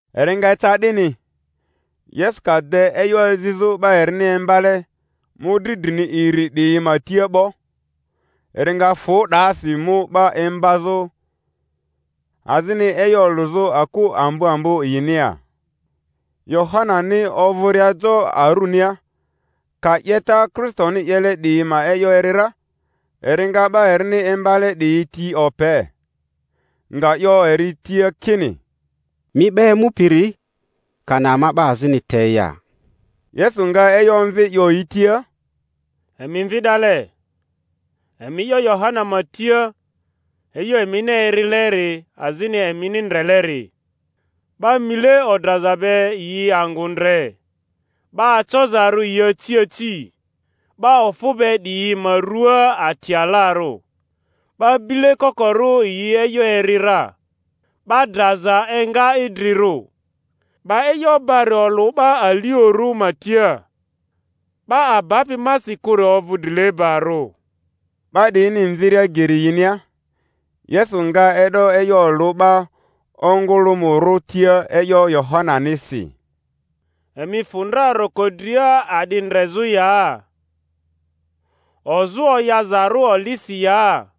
Eri nga eca 'dini, Yesu ka de e'yo azizᴜ 'ba erini imbale mᴜdri drini iri 'diyi ma tia 'bo, eri nga fᴜ 'dasi, mu 'ba imbazᴜ azini e'yo olᴜzᴜ aku ambo ambo yinia. Yohanani ovᴜria jo arunia, ka 'yeta Kristoni 'yele 'diyi ma e'yo eri ra, eri nga 'ba erini imbale 'diyi ti ope, nga 'yo eri tia kini, Mi 'ba emupiri, kani ama 'ba azini te ya? Yesu nga e'yo omvi, 'yo yi tia, Emi mvi 'dale, emi 'yo Yohana ma tia e'yo emini erileri azini emini ndreleri: 'ba mile odraza be yi angᴜ ndre, 'ba acozarᴜ yi aci aci, 'ba ofᴜ be 'diyi ma rᴜa ati alarᴜ, 'ba bile kokorᴜ yi e'yo eri ra, 'ba draza enga idrirᴜ, 'ba e'yo bari olᴜ 'ba aliorᴜ ma tia. 'Ba abapi masi kᴜri ovᴜ drilebarᴜ. 'Ba 'diyini mviria geri yinia, Yesu nga e'do e'yo olᴜ 'ba ongᴜlᴜmᴜrᴜ tia e'yo Yohananisi: Emi fᴜ ndra roko dria a'di ndrezᴜ ya? Ozᴜ oyazarᴜ olisi ya?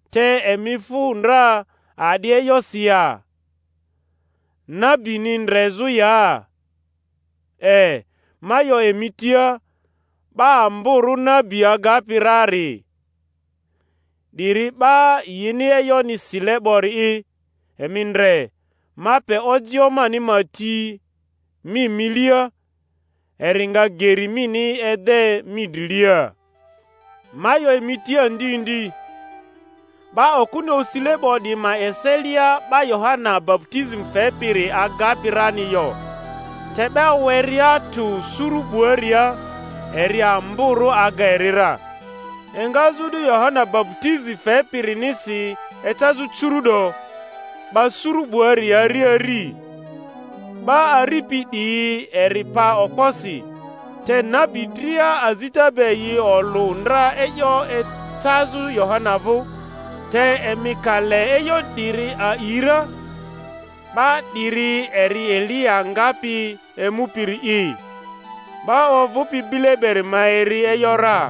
Te emi fᴜ ndra a'di e'yosi ya? Nabini ndrezᴜ ya? E, ma 'yo emi tia, 'ba amborᴜ nabi agapi rari. 'Diri 'ba yini e'yoni sile 'bori'i, Emi ndre, ma pe ojio mani ma ti mi milia, eri nga geri mini ede mi drilia. Ma 'yo emi tia ndi ndi, 'ba okᴜni osile 'bo 'diyi ma eselia 'ba Yohana baputizi fepiri agapi rani yo; te 'ba werea tᴜ suru 'buaria, eri amborᴜ aga eri ra. Engazᴜ o'du Yohana baputizi fepirinisi ecazᴜ curu’do, 'ba suru 'buari ari ari, 'ba aripi 'dryi eri pa okposi. Te nabi dria azita be yi olᴜ ndra e'yo ecazᴜ Yohana vᴜ; te emi ka le e'yo 'diri a'i ra, 'ba 'diri eri Eliya ngapi emupiri'i. 'Ba ovᴜpi bile beri ma eri e'yo ra.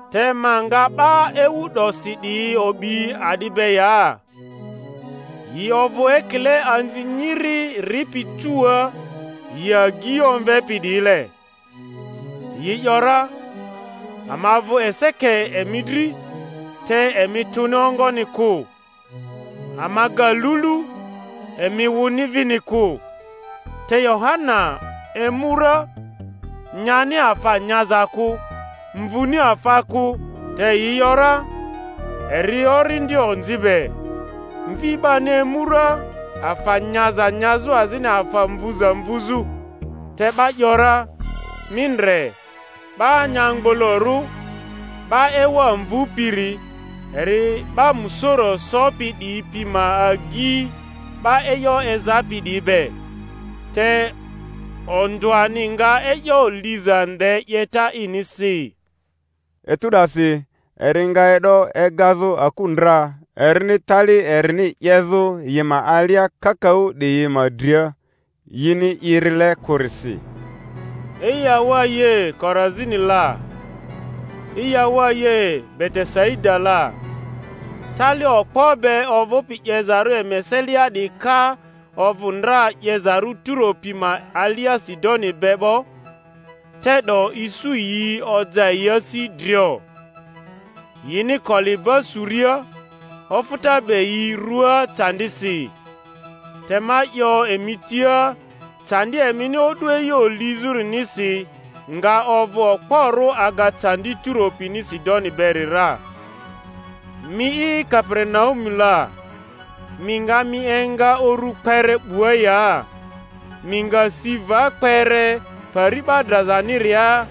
Te ma nga 'ba ewu 'dosi 'diyi o'bi a'di be ya? Yi ovᴜ ekile anzi nyiri ripi cuua, yi agyi omvepi 'diyile, yi ‘yora, Ama vᴜ eseke emi dri, te emi tᴜni ongoni kᴜ; ama ga lulu, emi wᴜni vini kᴜ. Te Yohana emu ra, nyani afa nyaza kᴜ, mvuni afa kᴜ, te yi ‘yora, Eri orindi onzi be; Mvi 'bani emu ra afa nyaza nyazᴜ azini afa mvuza mvuzᴜ, te 'ba ‘yora, Mi ndre, 'ba anyamgbolorᴜ, 'ba ewa mvupiri, eri 'ba musoro sopi 'diyi pi ma agyi 'ba e'yo ezapi 'diyi be! Te ondᴜani nga e'yo liza nde 'yeta inisi. Etu 'dasi eri nga e'do egazᴜ aku ndra erini tali erini 'yezᴜ yi ma alia kakaᴜ 'diyi ma dria, yini irile kᴜrisi. Eyawaye, Korazini la! Eyawaye, Betesaida la! Tali okpo be ovᴜpi 'yezarᴜ emi eselia 'diyi ka ovᴜ ndra 'yezarᴜ Turo pi ma alia Sidoni be 'bo, te'do isu yi oja yi asi drio, yini koliba suria, ofᴜta be yi ruaa candisi. Te ma 'yo emi tia, candi emini o'du e'yo lizᴜrinisi nga ovᴜ okporᴜ aga candi Turo pini Sidoni beri ra. Mi'i, Kaperinaumu la, mi nga mi enga uru kpere 'bua ya? Mi nga si va kpere Pari 'ba drazaniria.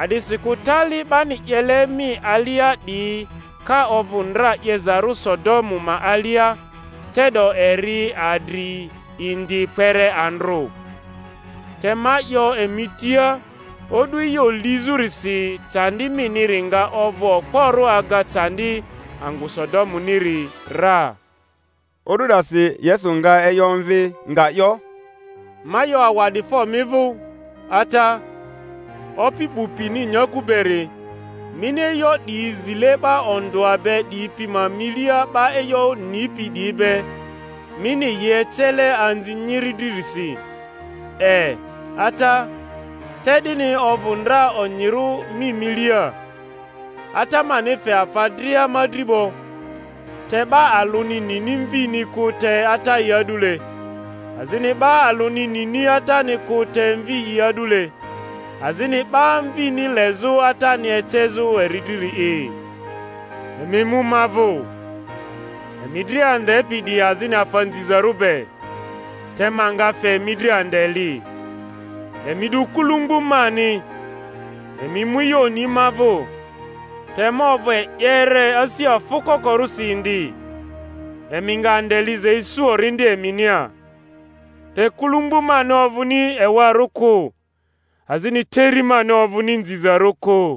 A'disikᴜ tali 'bani 'yele mi alia 'diyi ka ovᴜ ndra 'yezarᴜ Sodomu ma alia, te'do eri adri indi kpere andrᴜ. Te ma 'yo emi tia, o'du e'yo lizᴜrisi candi miniri nga ovᴜ okporᴜ aga candi angᴜ Sodomuniri ra. O'du 'dasi Yesu nga e'yo omvi, nga 'yo, Ma 'yo awa'difo mi vᴜ, Ata, Opi 'bu pini nyakᴜ beri, mini e'yo 'diyi zile 'ba ondᴜa be 'diyi pi ma milia 'ba e'yo nipi 'diyi be, mini yi ecele anzi nyiri dririsi; e, Ata, te 'dini ovᴜ ndra onyirᴜ mi milia. Ata mani fe afa dria ma dri 'bo; te 'ba alᴜni nini Mvini kᴜ te Ata'i a'dule, azini 'ba alᴜni nini Atani kᴜ te Mvi'i a'dule, azini 'ba Mvini lezᴜ Atani ecezᴜ eri driri'i. Emi emu ma vᴜ, emi dria andepi 'diyi azini afa nzizarᴜ be, te ma nga fe emi dri ande li. Emi 'du kulumbu mani, emi emu e'yo oni ma vᴜ; te ma ovᴜ e'yere, asi afᴜ kokorᴜsi indi; emi nga ande liza isu orindi eminia. Te kulumbu mani ovᴜni ewarᴜ kᴜ, azini teri mani ovᴜni nzizarᴜ kᴜ.